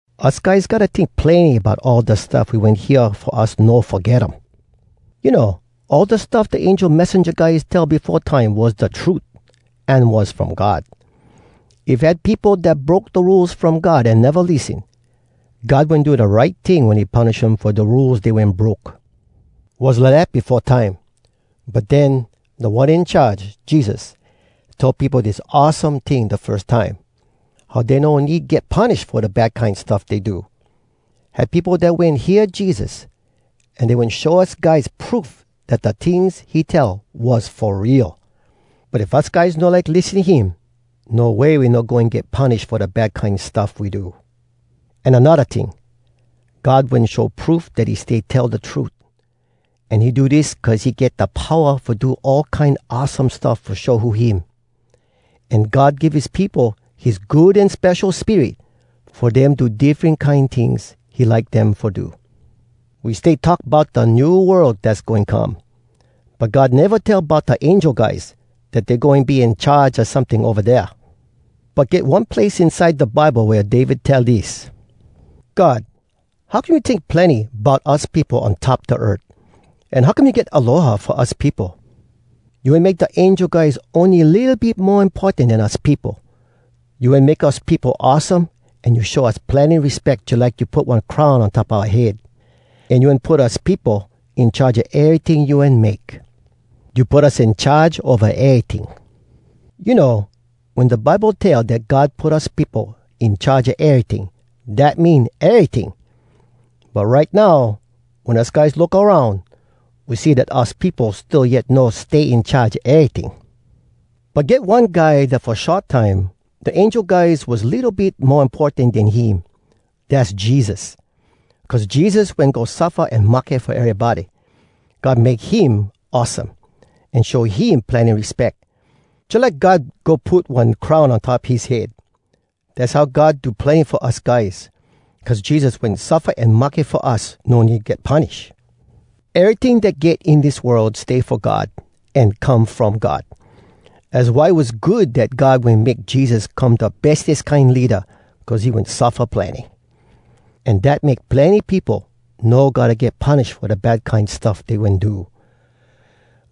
Us guys gotta tink plenny bout all da stuff we wen hear fo us no foget um. You know, all da stuff da angel messenja guys tell befo time was da trut, an was from God. If had peopo dat broke da Rules From God an neva lissen, God wen do da right ting wen he punish um fo da Rules dey wen broke. Was lidat befo time. But den, Da One In Charge, Jesus, tell peopo dis awesome ting da firs time—how dey no need get punish fo da bad kine stuff dey do! Had peopo dat wen hear Jesus, an dey wen show us guys proof dat da tings he tell was fo real. But if us guys no like lissen him, no way we no goin get punish fo da bad kine stuff we do. An anodda ting: God wen show proof dat he stay tell da trut. An he do dis cuz he get da powa fo do all kine awesome stuff fo show who him. An God give his peopo his Good An Spesho Spirit fo dem do diffren kine tings he like dem fo do. We stay talk bout da new world dass goin come. But God neva tell bout da angel guys, dat dey goin be in charge a someting ova dea. But get one place inside da Bible wea David tell dis: “God, how come you tink plenny bout us peopo on top da earth? An how come you get aloha fo us peopo? You wen make da angel guys Ony litto bit mo importan den us peopo. You wen make us peopo awesome An you show us plenny respeck Jalike you put one crown on top oua head. [An you wen put us peopo In charge a eryting you wen make.] You put us in charge ova eryting.” You know, wen da Bible tell dat God put us peopo in charge a eryting, dat mean eryting! But right now, wen us guys look aroun, we see dat us peopo still yet no “stay in charge a eryting.” But get one Guy dat “fo short time, da angel guys was litto bit mo importan den him.” Dass Jesus! Cuz Jesus wen go suffa an mahke fo erybody, God “make him awesome, an show him plenny respeck, jalike God go put one crown on top his head.” Dass how God do plenny fo us guys, cuz Jesus wen suffa an mahke fo us no need get punish. Eryting dat get in dis world stay fo God, an come from God. Az why was good dat God wen make Jesus come da bestes kine leada cuz he wen suffa plenny. An dat make plenny peopo no gotta get punish fo da bad kine stuff dey wen do.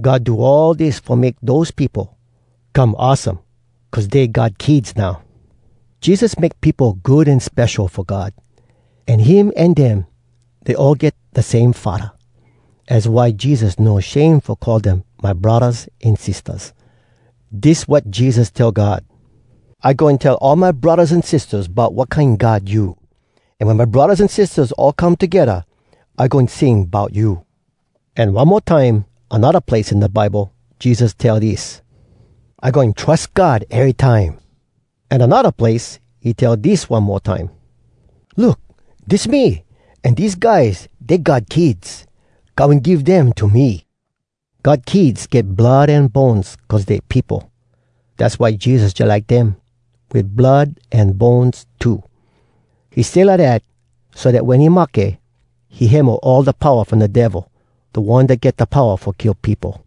God do all dis fo make dose peopo come awesome cuz dey God kids now. Jesus make peopo good an spesho fo God. An him an dem, dey all get da same Faddah. Az why Jesus no shame fo call dem “my braddahs an sistahs.” Dis wat Jesus tell God: “I goin tell all my braddahs an sistahs Bout wat kine god you. An wen my braddahs an sistahs all come togedda, I goin sing bout you.” An one mo time, anodda place in da Bible, Jesus tell dis: “I goin trus God erytime.” An anodda place, he tell dis one mo time: “Look! Dis me! An dese guys, dey God kids! God wen give dem to me!” God kids get blood an bones cuz dey peopo. Dass why Jesus jalike dem, wit blood an bones too. He stay lidat so dat wen he mahke, he hemo all da powa from da Devil, da one dat get da powa fo kill peopo.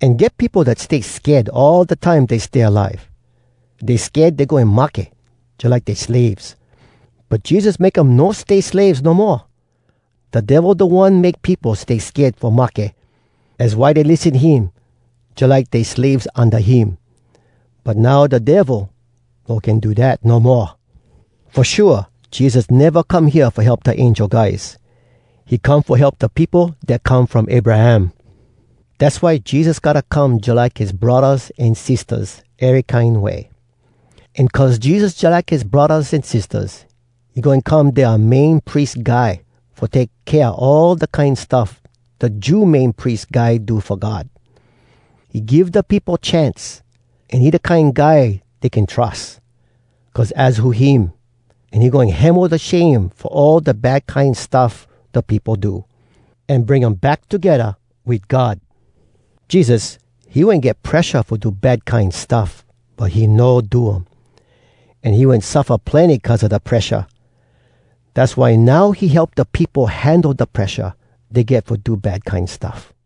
An get peopo dat stay sked all da time dey stay alive. Dey sked dey goin mahke, jalike dey slaves. But Jesus make um no stay slaves no moa. Da Devil da one make peopo stay sked fo mahke. Az why dey lissen him, jalike dey slaves unda him. But now da Devil no can do dat no moa. Fo shua Jesus neva come hea fo help da angel guys. He come fo help da peopo dat come from Abraham. Dass why Jesus gotta come jalike his braddahs an sistahs, ery kine way. An cuz Jesus jalike his braddahs an sistahs, he goin come dea Main Pries Guy fo take kea all da kine stuff da Jew Main Pries Guy do fo God. He give da peopo chance, an he da kine guy dey can trus. Cuz az who him, an he goin hemo da shame fo all da bad kine stuff da peopo do, an bring um back togedda wit God. Jesus, he wen get presha fo do bad kine stuff, but he no do um. An he wen suffa plenny cuz a da presha. Dass why now he help da peopo handle da presha dey get fo do bad kine stuff.